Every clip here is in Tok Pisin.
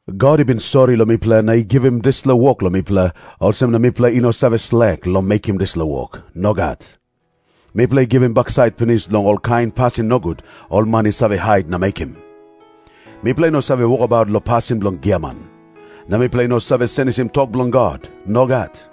God i bin sori long mipela na i givim dispela wok long mipela, olsem na mipela i no save slek long mekim dispela wok. Nogat. Mipela i givim baksait pinis long olkain pasin nogut ol man i save hait na mekim. Mipela i no save wokabaut long pasin bilong giaman. Na mipela i no save senisim tok bilong God. Nogat.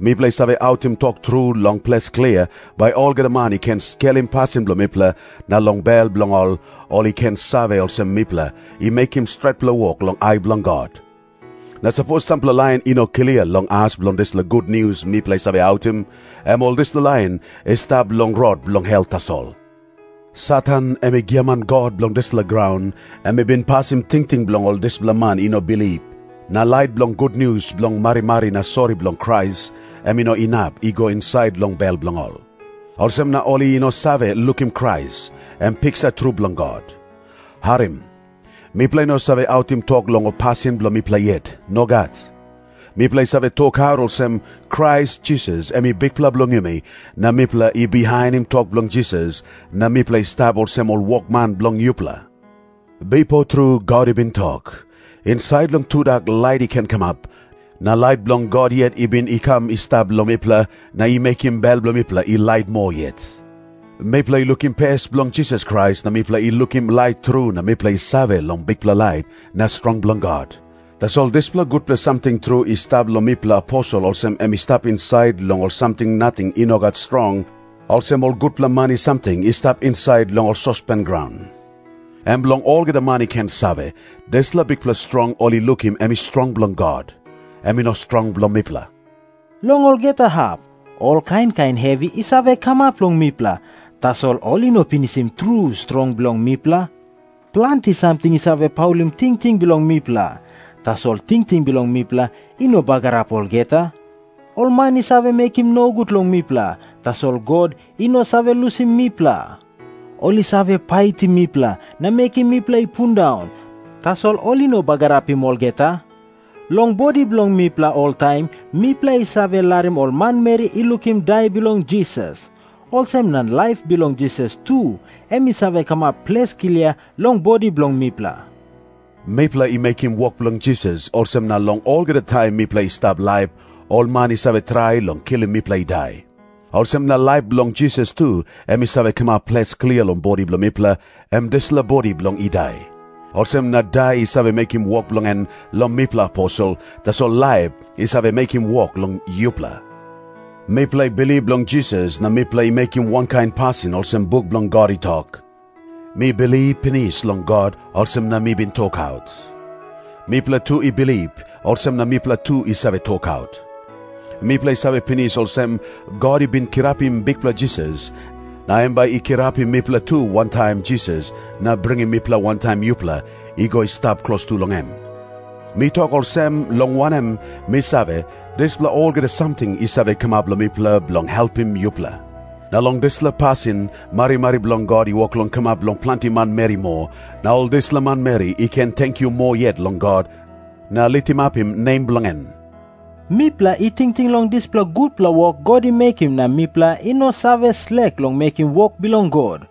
Mipela i save autim tok tru long ples klia, bai olgeta man i ken skelim pasin bilong mipela na long bel bilong ol, ol i ken save olsem mipela i mekim stretpela wok long ai bilong God. Na sapos sampela lain i no klia long as bilong dispela gutnius mipela i save autim, em ol dispela lain i stap long rot bilong hel tasol. Satan, em giaman god bilong dispela graun, em i bin pasim tingting bilong ol dispela man i no bilip, na lait bilong gutnius bilong marimari na sori bilong Krais, em i no inap i go insait long bel bilong ol. Olsem na ol i no save lukim Krais, em i piksa tru bilong God. Harim. Mipela i no save autim tok long ol pasin bilong mipela yet. Nogat. Mipela i save tokaut olsem, “Krais Jisas em i Bikpela bilong yumi, na mipela i bihainim tok bilong Jisas na mipela i stap olsem ol wokman bilong yupela.” Bipo tru God i bin tok, “Insait long tudak lait i ken kamap.” Na lait bilong God yet i bin i kam i stap long mipela, na i mekim bel bilong mipela i lait moa yet. Mipela i lukim pes bilong Jisas Krais na mipela i lukim lait tru na mipela i save long bikpela lait na strong bilong God. Tasol dispela gutpela samting tru i stap long mipela aposel olsem em i stap insait long ol samting nating i no gat strong, olsem ol gutpela mani samting i stap insait long ol sospen graun. Em bilong olgeta man i ken save, dispela bikpela strong ol i lukim em i strong bilong God. Em i no strong bilong mipela. Long olgeta hap, ol kain kain hevi i save kamap long mipela, tasol ol i no pinisim tru strong bilong mipela. Planti samting i save paulim tingting bilong mipela, tasol tingting bilong mipela i no bagarap olgeta. Ol man i save mekim nogut long mipela, tasol God i no save lusim mipela. Ol i save paitim mipela na mekim mipela i pundaun, tasol ol i no bagarapim olgeta. Long bodi bilong mipela oltaim mipela i save larim ol manmeri i lukim dai bilong Jisas. Olsem na laip bilong Jisas tu em i save kamap ples klia long bodi bilong mipela. Mipela i mekim wok bilong Jisas, olsem na long olgeta taim mipela i stap laip, ol man i save trai long kilim mipela i dai. Olsem na laip bilong Jisas tu em i save kamap ples klia long bodi bilong mipela, em dispela bodi bilong i dai. Olsem na dai i save mekim wok bilong en long mipela aposel, tasol laip i save mekim wok long yupela. Mipela i bilip long Jisas, na mipela i mekim wankain pasin olsem buk bilong God i tok, “Mi bilip pinis long God, olsem na mi bin tokaut.” Mipela tu i bilip, olsem na mipela tu i save tokaut. Mipela i save pinis olsem, God i bin kirapim Bikpela Jisas, na em bai i kirapim mipela tu wantaim Jisas, na bringim mipela wantaim yupela i go i stap klostu long em. Mi tok olsem, long wanem, mi save, dispela olgeta samting i save kamap long mipela bilong helpim yupela. Na long dispela pasin marimari bilong God i wok long kamap long planti manmeri moa, na ol dispela manmeri i ken tenkyu moa yet long God, na litimapim nem bilong en. Mipela i tingting long dispela gutpela wok God i mekim na mipela i no save slek long mekim wok bilong God.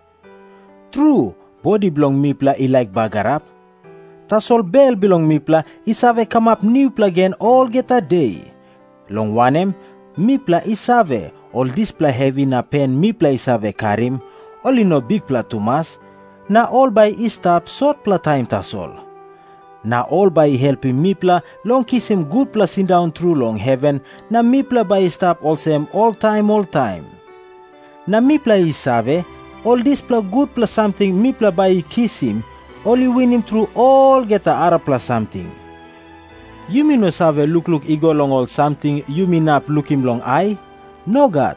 Tru, bodi bilong mipela i laik bagarap. Tasol bel bilong mipela i save kamap nupela gen long olgeta de, long wanem, mipela i save, ol dispela hevi na pen mipela i save karim, ol i no bikpela tumas, na ol bai i stap sotpela taim tasol. Na ol bai i helpim mipela long kisim gutpela sindaun tru long heven, na mipela bai i stap olsem oltaim oltaim. Na mipela i save, ol dispela gutpela samting mipela bai i kisim, ol i winim tru olgeta arapela samting. Yumi no save lukluk i go long ol samting yumi inap lukim long ai. Nogat.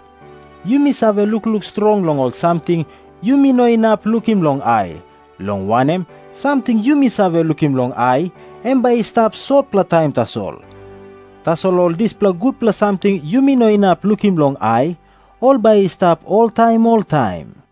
Yumi save lukluk strong long ol samting yumi no inap lukim long ai, long wanem, samting yumi save lukim long ai, em bai i stap sotpela taim tasol. Tasol ol dispela gutpela samting yumi no inap lukim long ai, ol bai i stap oltaim oltaim.